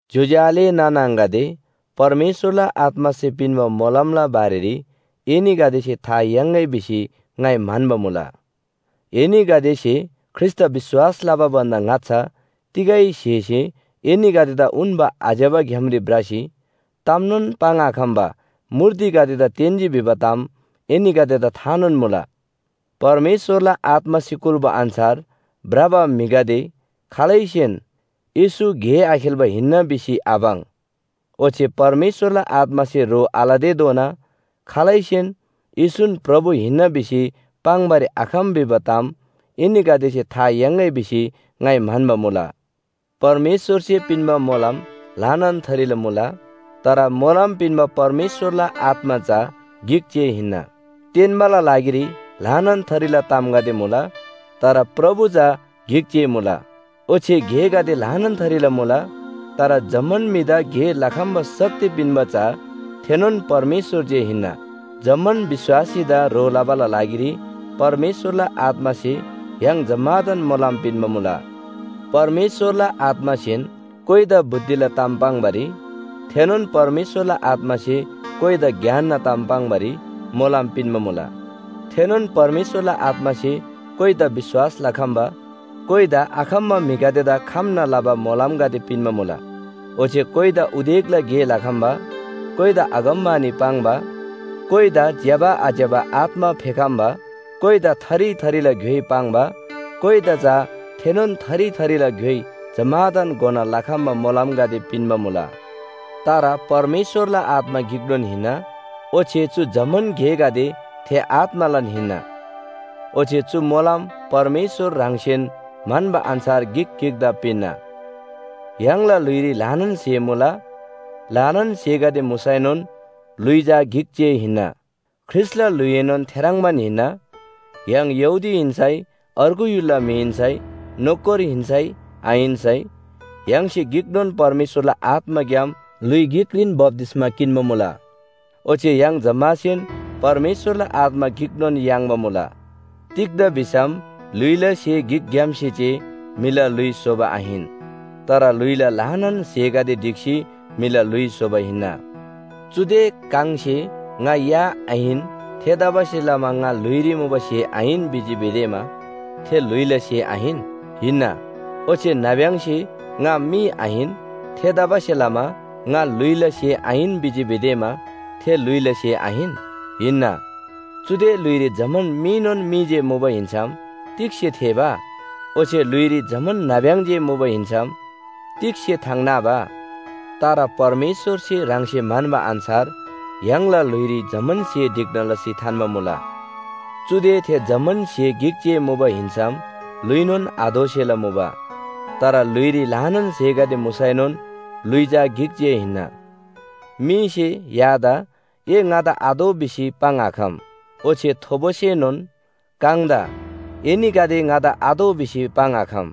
ज्‍योज्‍यो आले नाना आङागदे, परमेश्‍वरला आत्‍मासे पिन्‍बा मोलमला बारेरी एनीगदेसे था याङ्‌गै भिसी ङाइ म्‍हन्‍बा मुला। एनीगदेसे ख्रीष्‍टदा विश्‍वास लबा भन्‍दा ङाच्‍छा तिगै स्‍हेसे एनीगदेदा उन्‍बा आज्‍यबा ग्‍यामरी भ्रसी तामनोन पाङ्‌आखम्‍बा मूर्तिगदेदा तेन्‍जी भिबा ताम एनीगदेदा थानोन मुला। परमेश्‍वरला आत्‍मासे कुल्‍बा अन्‍छार भ्रबा म्‍हिगदे खालैसेन “येशू गे आखेल्‍बा हिन्‍ना” भिसी आपाङ्। ओच्‍छे परमेश्‍वरला आत्‍मासे ह्रो आलतेधोना खालैसेन “येशून प्रभु हिन्‍ना” भिसी पाङ्‌बारी आखम भिबा ताम एनीगदेसे था याङ्‌गै भिसी ङाइ म्‍हन्‍बा मुला। परमेश्‍वरसे पिन्‍बा मोलम ल्‍हानान थरीला मुला, तर मोलम पिन्‍बा परमेश्‍वरला आत्‍मा चा गिक जे हिन्‍ना। तेन्‍बाला लागिरी ल्‍हानान थरीला तामगदे मुला, तर प्रभु चा गिक जे मुला। ओच्‍छे गेगदे ल्‍हानान थरीला मुला, तर जम्‍मान म्‍हिदा गे लखम्‍बा शक्ति पिन्‍बा चा थेनोन परमेश्‍वर जे हिन्‍ना। जम्‍मान विश्‍वासीदा ह्रो लबाला लागिरी परमेश्‍वरला आत्‍मासे य्‍हाङ जम्‍मादान मोलम पिन्‍बा मुला। परमेश्‍वरला आत्‍मासेन कोइदा बुद्धिला ताम पाङ्‌बारी, थेनोन परमेश्‍वरला आत्‍मासे कोइदा ज्ञानना ताम पाङ्‌बारी मोलम पिन्‍बा मुला। थेनोन परमेश्‍वरला आत्‍मासे कोइदा विश्‍वास लखम्‍बा, कोइदा आखम्‍बा म्‍हिगदेदा खम्‍ना लबा मोलमगदे पिन्‍बा मुला। ओच्‍छे कोइदा उदेकला गे लखम्‍बा, कोइदा अगमवाणी पाङ्बा, कोइदा ज्‍यबा आज्‍यबा आत्‍मा फेखम्‍बा, कोइदा थरी थरीला ग्‍योइ पाङ्बा, कोइदा चा थेनोन थरी थरीला ग्‍योइ जम्‍मादान घोना लखम्‍बा मोलमगदे पिन्‍बा मुला। तर परमेश्‍वरला आत्‍मा गिकनोन हिन्‍ना ओच्‍छे चु जम्‍मान गेगदे थे आत्‍मालान हिन्‍ना। ओच्‍छे चु मोलम परमेश्‍वर ह्राङसेन म्‍हन्‍बा अन्‍छार गिक गिकदा पिन्‍ना। य्‍हाङला ल्‍हुइरी ल्‍हानान स्‍हे मुला। ल्‍हानान स्‍हेगदे मुसैनोन ल्‍हुइ चा गिक जे हिन्‍ना, ख्रीष्‍टला ल्‍हुइएनोन थेह्रङ्बान हिन्‍ना। य्‍हाङ यहूदी हिन्‍सै, अर्गु य्‍हुलला म्‍हि हिन्‍सै, नोकर हिन्‍सै आहिन्‍सै य्‍हाङसे गिकनोन परमेश्‍वरला आत्‍माग्‍याम ल्‍हुइ गिकरीन बप्‍तिस्‍मा किन्‍बा मुला। ओच्‍छे य्‍हाङ जम्‍मासेन परमेश्‍वरला आत्‍मा गिकनोन याङ्बा मुला। तिग्‍दा भिसम ल्‍हुइला स्‍हे गिकग्‍यामसे जे म्‍हिला ल्‍हुइ स्‍होबा आहिन, तर ल्‍हुइला ल्‍हानान स्‍हेगदे ढिक्‍सी म्‍हिला ल्‍हुइ स्‍होबा हिन्‍ना। चुदे काङसे “ङा या आहिन, थेतबासेलमा ङा ल्‍हुइरी मुबा स्‍हे आहिन” भिजी भिदेमा थे ल्‍हुइला स्‍हे आहिन? हिन्‍ना। ओच्‍छे नाब्‍यङसे “ङा मी आहिन, थेतबासेलमा ङा ल्‍हुइला स्‍हे आहिन” भिजी भिदेमा थे ल्‍हुइला स्‍हे आहिन? हिन्‍ना। चुदे ल्‍हुइरी जम्‍मान मीनोन मी जे मुबा हिन्‍सम तिग्‍से थेःबा? ओच्‍छे ल्‍हुइरी जम्‍मान नाब्‍यङ जे मुबा हिन्‍सम तिग्‍से थाङ नाबा? तर परमेश्‍वरसे ह्राङसे म्‍हन्‍बा अन्‍छार य्‍हाङला ल्‍हुइरी जम्‍मान स्‍हे ढिक्‍ना लसी थान्‍बा मुला। चुदे थे जम्‍मान स्‍हे गिक जे मुबा हिन्‍सम ल्‍हुइनोन आदोसेला मुबा। तर ल्‍हुइरी ल्‍हानान स्‍हेगदे मुसैनोन ल्‍हुइ चा गिक जे हिन्‍ना। मीसे यादा “ए ङादा आतोः” भिसी पाङ्‌आखम, ओच्‍छे थोबोसेनोन काङदा “एनीगदे ङादा आतोः” भिसी पाङ्‌आखम।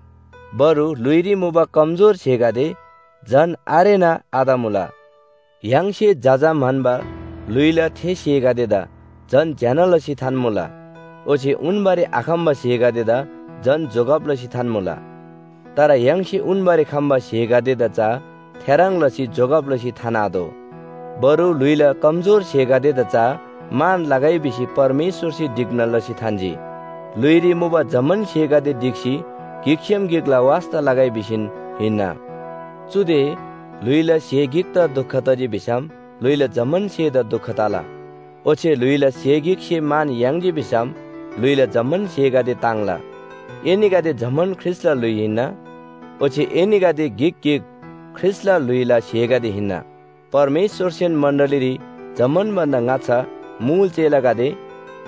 बरु ल्‍हुइरी मुबा कमजोर स्‍हेगदे झन आरेना आतमुला। य्‍हाङसे जजा म्‍हन्‍बा ल्‍हुइला थे स्‍हेगदेदा झन ज्‍यना लसी थान्‍मुला। ओच्‍छे उन्‍बारी आखम्‍बा स्‍हेगदेदा झन जोगब लसी थान्‍मुला। तर य्‍हाङसे उन्‍बारी खम्‍बा स्‍हेगदेदा चा थेह्रङ् लसी जोगब लसी थान्‍आतोः। बरु ल्‍हुइला कमजोर स्‍हेगदेदा चा मान लगै भिसी परमेश्‍वरसे ढिक्‍ना लसी थान्‍जी। ल्‍हुइरी मुबा जम्‍मान स्‍हेगदे ढिक्‍सी गिकसेम गिकला वास्‍ता लगै भिसीन हिन्‍ना। चुदे ल्‍हुइला स्‍हे गिकदा दुख तजी भिसम ल्‍हुइला जम्‍मान स्‍हेदा दुख तला। ओच्‍छे ल्‍हुइला स्‍हे गिकसे मान याङ्जी भिसम ल्‍हुइला जम्‍मान स्‍हेगदे ताङ्ला। एनीगदे जम्‍मान ख्रीष्‍टला ल्‍हुइ हिन्‍ना, ओच्‍छे एनीगदे गिक गिक ख्रीष्‍टला ल्‍हुइला स्‍हेगदे हिन्‍ना। परमेश्‍वरसेन मण्‍डलीरी जम्‍मान भन्‍दा ङाच्‍छा मुल चेलागदे,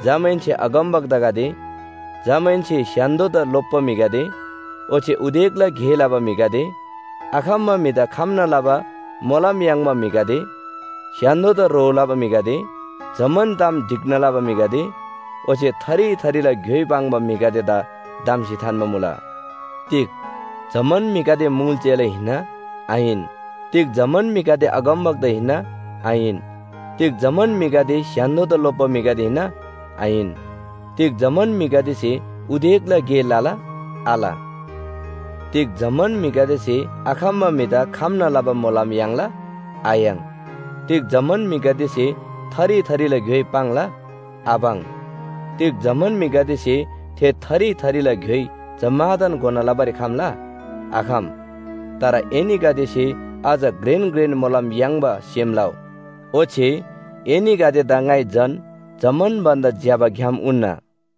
जमाहेन्‍से अगमवक्तागदे, जमाहेन्‍से स्‍य्‍हान्‍दोदा लोप्‍बा म्‍हिगदे, ओच्‍छे उदेकला गे लबा म्‍हिगदे, आखम्‍बा म्‍हिदा खम्‍ना लबा मोलम याङ्बा म्‍हिगदे, स्‍य्‍हान्‍दोदा ह्रो लबा म्‍हिगदे, जम्‍मान ताम ढिक्‍ना लबा म्‍हिगदे, ओच्‍छे थरी थरीला ग्‍योइ पाङ्बा म्‍हिगदेदा धम्‍सी थान्‍बा मुला। तिग जम्‍मान म्‍हिगदे मुल चेला हिन्‍ना? आहिन। तिग जम्‍मान म्‍हिगदे अगमवक्ता हिन्‍ना? आहिन। तिग जम्‍मान म्‍हिगदे स्‍य्‍हान्‍दोदा लोप्‍बा म्‍हि हिन्‍ना? आहिन। तिग जम्‍मान म्‍हिगदेसे उदेकला गे लला? आल। तिग जम्‍मान म्‍हिगदेसे आखम्‍बा म्‍हिदा खम्‍ना लबा मोलम याङ्ला? आयाङ्। तिग जम्‍मान म्‍हिगदेसे थरी थरीला ग्‍योइ पाङ्ला? आपाङ्। तिग जम्‍मान म्‍हिगदेसे थे थरी थरीला ग्‍योइ जम्‍मादान घोना लबारी खम्‍ला? आखम। तर एनीगदेसे अझ घ्रेन घ्रेन मोलम याङ्बा सेम लउ। ओच्‍छे एनीगदेदा ङाइ झन जम्‍मान भन्‍दा ज्‍यबा ग्‍याम उन्‍ना।